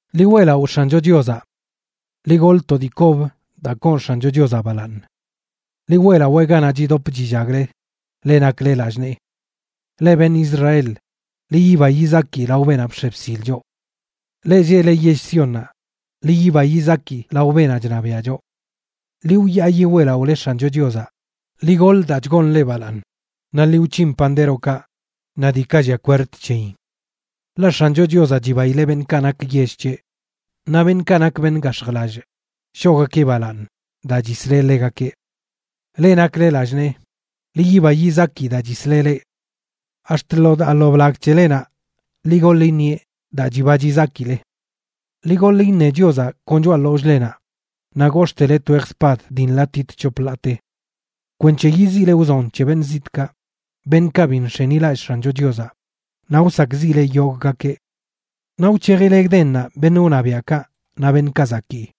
¡Ḻi weꞌlaꞌo X̱ancho Chiozaꞌ! Ḻi goḻ to dii kob daa koon X̱ancho Chiozaꞌ balaaṉ. Ḻi weꞌlawee ganaꞌ chidop chillagle, leꞌ nakle lallꞌ nee. Leꞌ beṉꞌ Israel, ḻi yiba yizaki lao beenaꞌ bx̱e bsil choꞌ. Leꞌ lleꞌle yell Siónnaꞌ, ḻi yiba yizaki lao beenaꞌ chṉabiaꞌ choꞌ. Ḻi wyaayi weꞌlaꞌole X̱ancho Chiozaꞌ, ḻi goḻ daa chgoon ḻeꞌ balaaṉ, naꞌ ḻi wc̱hin pandérokaꞌ naꞌ diikaꞌ llia kwerd c̱heyin. Ḻaꞌ X̱ancho Chiozaꞌ chibaileꞌ beṉꞌkaꞌ nak yell c̱heꞌ; naꞌ beṉꞌkaꞌ nak beṉꞌ gax̱jlallꞌ shoꞌgakeꞌ balaaṉ daa chisleꞌ ḻegakeꞌ. Leꞌ nakle lallꞌ nee, ḻi yiba yizaki daa chisleꞌ leꞌ. Ax̱t lo daa lo blag c̱helenaꞌ ḻi goḻ iṉieꞌ daa chiba chizakile. Ḻi goḻ iṉe Chiozaꞌ kon choꞌa ḻollꞌlenaꞌ naꞌ gox̱ꞌtele twej spad dii nḻatit c̱hop ḻaate, kwenc̱he yiziꞌle wzon c̱he beṉꞌ zitꞌkaꞌ, beṉꞌkaꞌ bi nx̱enilallꞌ X̱ancho Chiozaꞌ, naꞌ wsakꞌziꞌle yogꞌgakeꞌ. Naꞌ wc̱hejile gdennaꞌ beṉꞌ wṉabiaꞌkaꞌ naꞌ beṉꞌkaꞌ zakii